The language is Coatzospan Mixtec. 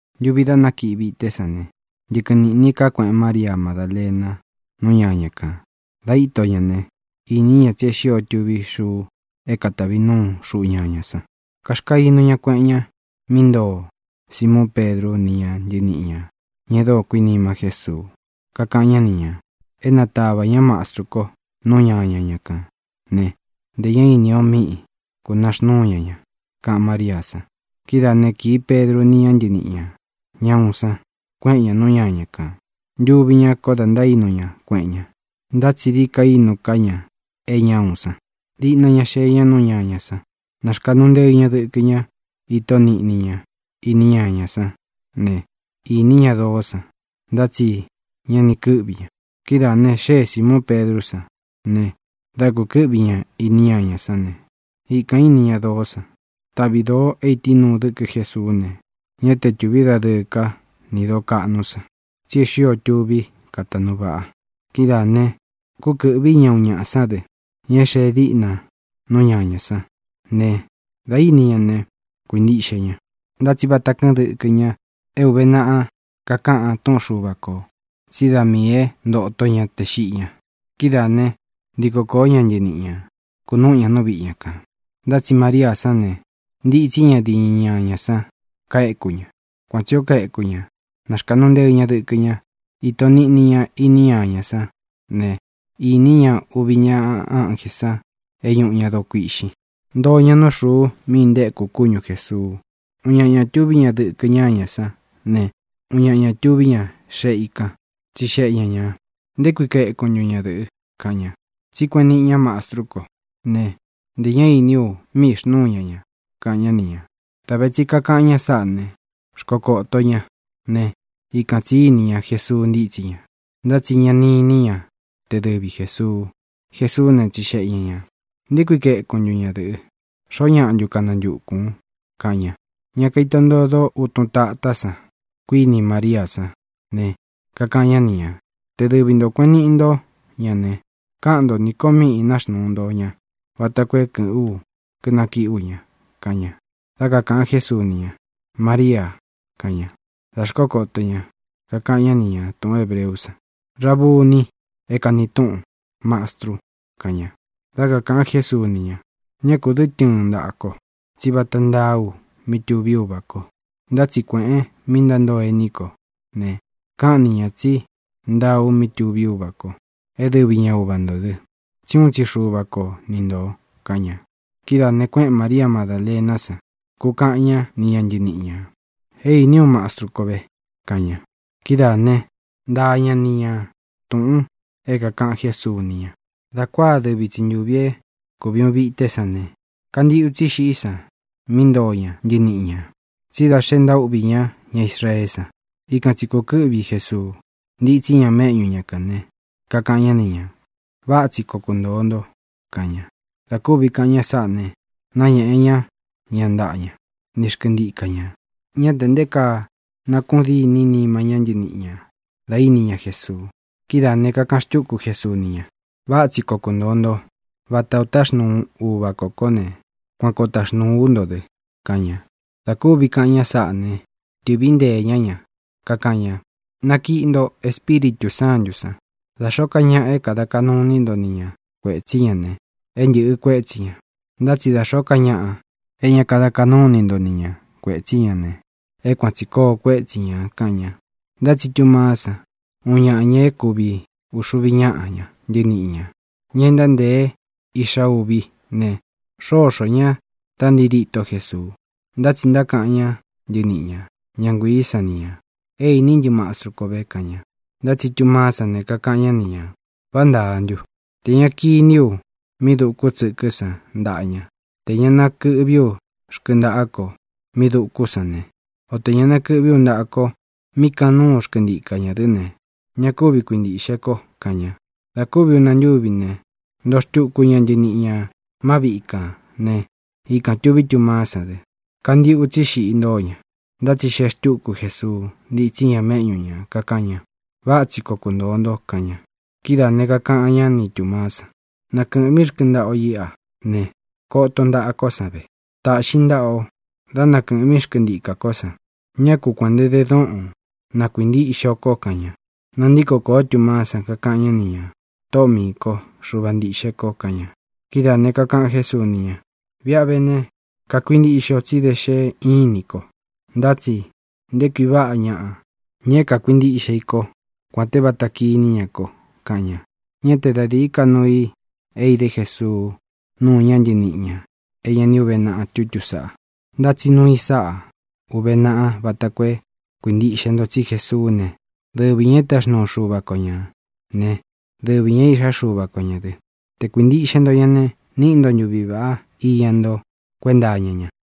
Ntuvi dá nakiꞌi vité san ne, ntɨkɨn nīꞌni ká kueꞌen María Madālena nú ñaña kān. Dā íto ña ne, īní ña tsí e xío tuví xuu é katāvi núu xuꞌu ñañā san. Kaxkainu ña kueꞌen ña mí ntoo Simuun Pedru ni ña ntɨníꞌi ñā, ña e dóo kuinima Jésuu. Kakaꞌan ñá ni ñā: —É nātavá ña Mastru ko nú ñaña ña kān né, ntē ñá īni o míꞌi kūnaxnúu ña ña —kaꞌan Maríā san. Kidáā né, kīi Pedru ni ña ntɨníꞌi ñā, ña uun san, kueꞌen ñá nú ñaña kān. Ntuvi ñá koo da ntaínu ña kueꞌen ña, ntá tsi dií ka inú ka ña é ña uun san. Diꞌna ña xee ña nú ñañā san. Náxkāꞌnu nteɨ ña dɨkɨ ña, íto niꞌni ña iní ñañā sán ne, īní ña doó san, ntá tsi ña ni kɨ́ꞌvi ña. Kidáā ne, xée Sīmuun Pedrú san ne, dā kukɨ́ꞌvi ña īní ñañā sán ne, ikān íni ña doó san. Taꞌvi dōo é ītínuu dɨkɨ Jésuú ne, ñá te tūví dadɨɨ ká ni dōo kaꞌnú san, tsí e xío tuví kataꞌnu vaꞌa. Kidáā ne, kúkɨ̄ꞌví ña uun ñaꞌa sán dɨ, ña é xee díꞌna nú ñañā sán ne, dā íni ña ne, kuīntiꞌxe ña. Ntá tsi vata kɨ́ꞌɨn dɨkɨ ña é uve naꞌa kakaꞌan túꞌun Xuva kō tsí da miī é ntoto ña tē xiꞌi ña. Kidáā né, ntiko kōó ña ntɨniꞌi ñā, kunúꞌu ña nú viꞌi ña kān. Ntá tsi Maríā sán ne, ntitsí ña diñɨ ñáña san, kaéku ña. Kuan tsī ó kaeku ña, náxkāꞌnu nteɨ ña dɨkɨ ña, íto niꞌni ña iní ñañā sán ne, īní ña uvi ñaꞌa ánjē san é ñuꞌu ña doo kuiꞌxin. Ntoo ña nú xuu mí intéku kúñu Jēsuu. Uun ñaꞌa ña tuví ña dɨkɨ́ ñañā sán ne, uun ñaꞌa ña tuví ña xeꞌe i kan. Tsixeꞌe ña ñā: —¿Nté kui kaekun ntun, ñadɨ̄ꞌɨ? —kaꞌan ña. —Tsí kueꞌen niꞌi ña Mastru kó ne, ntē ñá iní u míꞌī xnúu ña ña —kaꞌan ñá ni ñā. Dā ve tsi kakaꞌan ña sáꞌa ne, xkokōto ñá ne, ikan tsī íni ña Jesuu ntítsí ña, ntá tsi ña ni iní ña te dɨvi Jēsuu. Jesuú ne, tsixeꞌe ña ñā: —¿Nté kui kaekun ntun, ñadɨ̄ꞌɨ? ¿Xoó ñaꞌa ntu kanantukūn? —kaꞌan ña. Ña kaito ntodo útun tatá san, kuíni Maríā sán ne, kakaꞌan ñá ni ñā: —Te dɨvi nto kuēꞌen niꞌi ntó ña ne, káꞌan nto nī ko míꞌī náxnuu nto ñā vata koo é kɨ̄ꞌɨ́n u, kínakiꞌí u ña —kaꞌan ña. Dá kakāꞌan Jésuu ni ña: —¡Maríā! —kaꞌan ña. Dā xkókoto ña, kakaꞌan ñá ni ña tūꞌun hébreú san: —¡Rabuni! (é kāni túꞌun Mastru) —kaꞌan ña. Dá kakāꞌan Jésuu ni ña: —Ñá kū dɨ́ tɨɨn ntaꞌān ko, tsí vata ntáā u mí tuví Uvā ko. Ntá tsi kuēꞌen mí ntántoo ení ko ne, káꞌan ni ñā tsí ntaa u mí tuví Uvā ko, é dɨvi ña Uva ntō dɨ, tsí uun tsi Xuva ko ni ntō —kaꞌan ña. Kidáā ne, kuéꞌen Māría Madālená san, kukaꞌan ñá ni ña ntɨniꞌi ñā: —¡É īní u Mastru kó ve! —kaꞌan ña. Kidáa ne, ntaa ña ni ña tūꞌun é kākaꞌan Jésuu ni ña. Dā kuáa dɨvi tsi ntūvi é kuvi uun vité san ne, kantīꞌu tsí xiꞌí san mí ntoo ña ntɨniꞌi ñā, tsí da xe ntaúꞌvī ñá ña Israeé san. Ikan tsi kūkɨ́ꞌvi Jesuu, ntítsí ña méꞌñu ña kān ne, kakaꞌan ñá ni ñā: —Váꞌa tsi koo kuntōo nto —kaꞌan ña. Dā kúvi kaꞌan ña sáꞌā ne, náñēꞌe ñá ña ntaꞌa ña ni xkɨntika ñā. Ñá tē nté kaa nakuꞌun díni nima ñá ntɨniꞌi ñā da íni ña Jesuu. Kidáā ne, kakaꞌan xtúku Jesuu ni ña: —Váꞌa tsi koo kuntōo nto. Vata ō táxnuu Uvā kó ko ne, kuan koo taxnūu ú nto dɨ —kaꞌan ña. Dā kúvi kaꞌan ña sáꞌa ne, tɨ̄ꞌví nteē ñá ña, kakaꞌan ña: —Nakiꞌi nto Espíritū Sántū san. Da xōó ka ñaꞌa é kāda kaꞌnu iní nto ni ña kuētsí ña ne, é ntɨ̄ꞌɨ kuétsi ñā. Ntá tsi da xōó ka ñaꞌa é ña kada kaꞌnú ini nto ni ña kuētsí ña ne, é kuan tsī koo kuétsi ñā —kaꞌan ña. Ntá tsi Tumaá san, uun ñaꞌa ña é kuvi uxuvi ñáꞌa ña ntɨniꞌi ñā, ña e ntántēe Iꞌxa Uví ne, xóxō ña da ntii dîtó Jesuu. Ntá tsi ntákaꞌan ñá ntɨniꞌi ña, ña nguiī san ni ña: —É īní ntɨ Mastru kó ve —kaꞌan ña. Ntá tsi Tumaá san ne, kakaꞌan ñá ni ñā: —¿Vá ntāa ntu? Tē ña kiní u mí dūku tsɨkɨ́ san ntaꞌa ña, tē ña nakɨꞌví u rkɨntaꞌá ko mí dūkú san ne, o tē ñá nakɨꞌví u ntaꞌa ko mí kanúu xkɨntika ñā dɨ́ ne, ña kúvi kuintīꞌxe ko —kaꞌan ña. Dā kúvi ūna ntúvi ne, ntoo xtuku ña ntɨniꞌi ñā má viꞌi kān né, ikān tuví Tumaá san dɨ. Kantiꞌu tsí xiꞌi ntóo ña, ntá tsi xee xtúku Jesuu, ntítsi ña méꞌñu ñā, kakaꞌan ña: —Váꞌa tsi koo kuntōo nto —kaꞌan ña. Kidáā ne, kakaꞌan ñá ni Tūmaá san: —Nakɨ̄ꞌvín rkɨntaꞌa o iꞌa ne, koton ntaꞌa kó san ve. Tāꞌxin ntaꞌa o, dá nakɨ̄ꞌvín xkɨntikā kó san. Ñá ku kuān nte dóꞌon; na kuīntiꞌxe o ko —kaꞌan ña. Nantíko kōó Tumaá san, kakaꞌan ñá ni ñā: —¡Tōꞌó miī ko! ¡Xuva ntīꞌxe ko! —kaꞌan ña. Kidáā ne, kakaꞌan Jésuu ni ña: —Viꞌi a vé ne, kakuintiꞌxe o tsí da xe ínin ko. Ntá tsi ¡nté kui vaꞌá ñaꞌa, ña é kakuintiꞌxe i kó kuān te vata kiní ña ko! —kaꞌan ña. Ñá te da dīí ka nuu i é idé Jesuu núu ñá ntɨniꞌi ñā é ña ni úve naꞌa tutú saꞌa. Ntá tsi nuu i sáꞌa ūve naꞌa vata koo é kuīntiꞌxe nto tsí Jesuú ne, dɨvi ñā é táxnuu Xuva ko ñā né, dɨvi ñā é Īꞌxá Xuva ko ñā dɨ. Te kuīntiꞌxe nto ña ne, níꞌi nto ntuvi vāꞌá iña ntó kuenta iña ña.